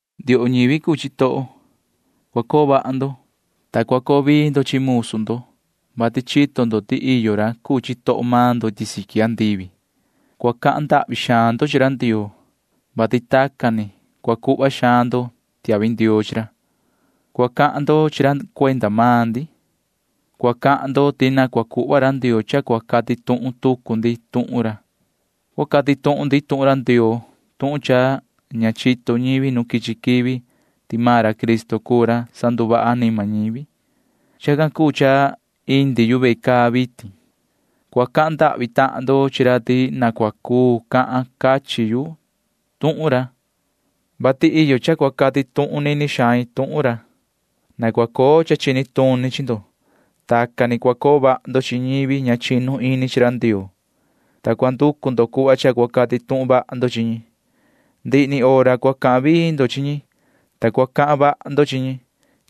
Ndioho ñivi cuu chitoho, cua coo vaha ndo, ta cua coo vii ndo chi musu ndo, vati chito ndo ti iyo ra cuu chitoho maan ndo iti siqui andivi. Cua cahan ndahvi xaan ndo chi ra Ndioo, vati tacan ni cua cuhva xaan ndo tiahvi ndioo chi ra. Cua cahan ndo chi ra cuenda maan ndi. Cua cahan ndo ti na cua cuhva ra Ndioo cha cua cati tuhun tucu ndi tuhun ra. Cua cati tuhun ndi tuhun ra Ndioo tuhun cha ña chito ñivi nu quichi quivi ti maan ra Cristo cuu ra sanduvaha anima ñivi. Chacan cuu cha indi yu ve caa vitin. Cua cahan ndahvi tahan ndo chi ra ti na cua cuu cati cachin yu tuhun ra, vati iyo cha cua cati tuhun nini xain tuhun ra. Na cua coo cha chini tuni chi ndo. Tacan ni cua coo vaha ndo chi ñivi ña chinu ini chi ra Ndioo, ta cua nducu ndo cuhva cha cua cati tuhun vaha ndo chi ñi. Ndihi ni hora cua cahan vii ndo chi ñi, ta cua cahan vaha ndo chi ñi.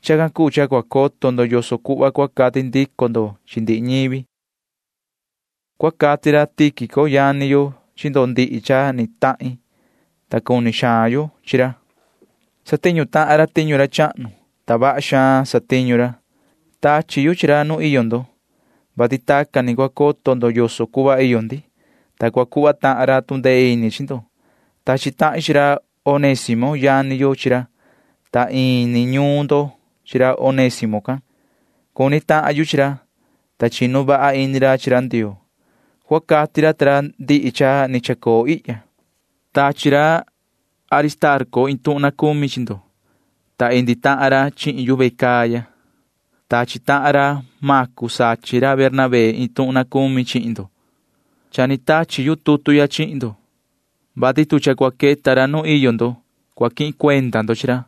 Chacan cuu cha cua coto ndo yoso cuhva cua cati ndico ndo chi ndihi ñivi. Cua cati ra Tíquico yani yo chi ndo ndihi cha ni tahin, ta cuni xaan yo chi ra. Satiñu tahan ra tiñu ra chahnu, ta vaha xaan satiñu ra. Tachi yu chi ra nu iyo ndo, vati tacan ni cua coto ndo yoso cuhva iyo ndi, ta cua cuhva tahan ra tu ndee ini chi ndo. Tachi tahin chi ra Onésimo yani yo chi ra, ta ini ñuun ndo chi ra Onésimo can. Cuni tahan yu chi ra, ta chinu vaha ini ra chi ra Ndioo. Cua cati ra ta ra ndihi cha ni chacoo ihya. Tachi ra Aristarco iin tuhun na cumi chi ndo, ta iyo tahan ra chihin yu ve caa ya. Tachi tahan ra Macu sachin ra Bernabé iin tuhun na cumi chi ndo. Cha ni tachi yu tutu chi ndo, vati tu cha cua queta ra nu iyo ndo, cua quihin cuenda ndo chi ra.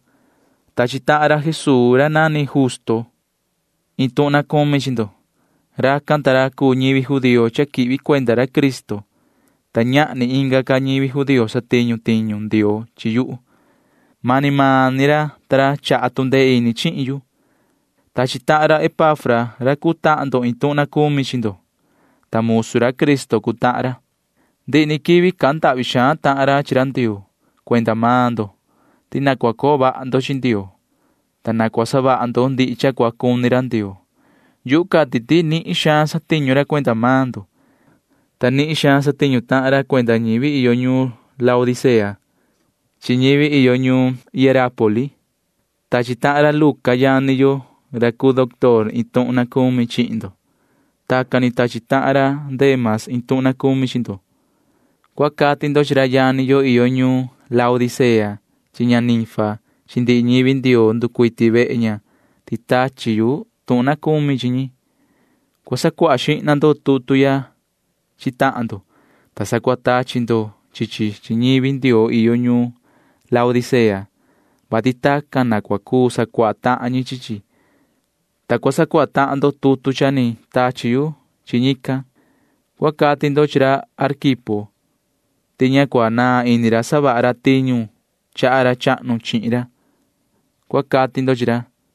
Tachi tahan ra Jesuu ra nani Justo iin tuhun na cumi chi ndo. Racan ta ra cuu ñivi judío cha quihvi cuenda ra Cristo, ta ñahni inga ca ñivi judío satiñu tiñu Ndioo chi yuhu. Mani maan ni ra ta ra chaha tu ndee ini chihin yu. Tachi tahan ra Epafra ra cuu tahan ndo iin tuhun na cumi chi ndo, ta musu ra Cristo cuu tahan ra. Ndihi ni quivi cahan ndahvi xaan tahan ra chi ra Ndioo cuenda maan ndo ti na cua coo vaha ndo chi Ndioo, ta na cua savaha ndo ndihi cha cua cuni ra Ndioo. Yuhu cati ti nihin xaan satiñu ra cuenda maan ndo, ta nihin xaan satiñu tahan ra cuenda ñivi iyo ñuun Laodicea chi ñivi iyo ñuun Hierápoli. Tachi tahan ra Luca yani yo ra cuu doctor iin tuhun na cumi chi ndo. Tacan ni tachi tahan ra Dema iin tuhun na cumi chi ndo. Cua cati ndo chi ra yani yo iyo ñuun Laodicea chi ña Ninfa chi ndihi ñivi Ndioo nducuiti vehe ña ti tachi yu iin tuhun na cumi chi ñi. Cua sacuaha xihna ndo tutu ya chi tahan ndo, ta sa cua tachi ndo chi chi chi ñivi Ndioo iyo ñuun Laodicea, vati tacan na cua cuu sacuaha tahan ñi chi chi, ta cua sacuaha tahan ndo tutu cha ni tachi yu chi ñican. Cua cati ndo chi ra Arquipo ti ña cua naan ini ra savaha ra tiñu chaha ra chahnu chihin ra, cua cati ndo chi ra.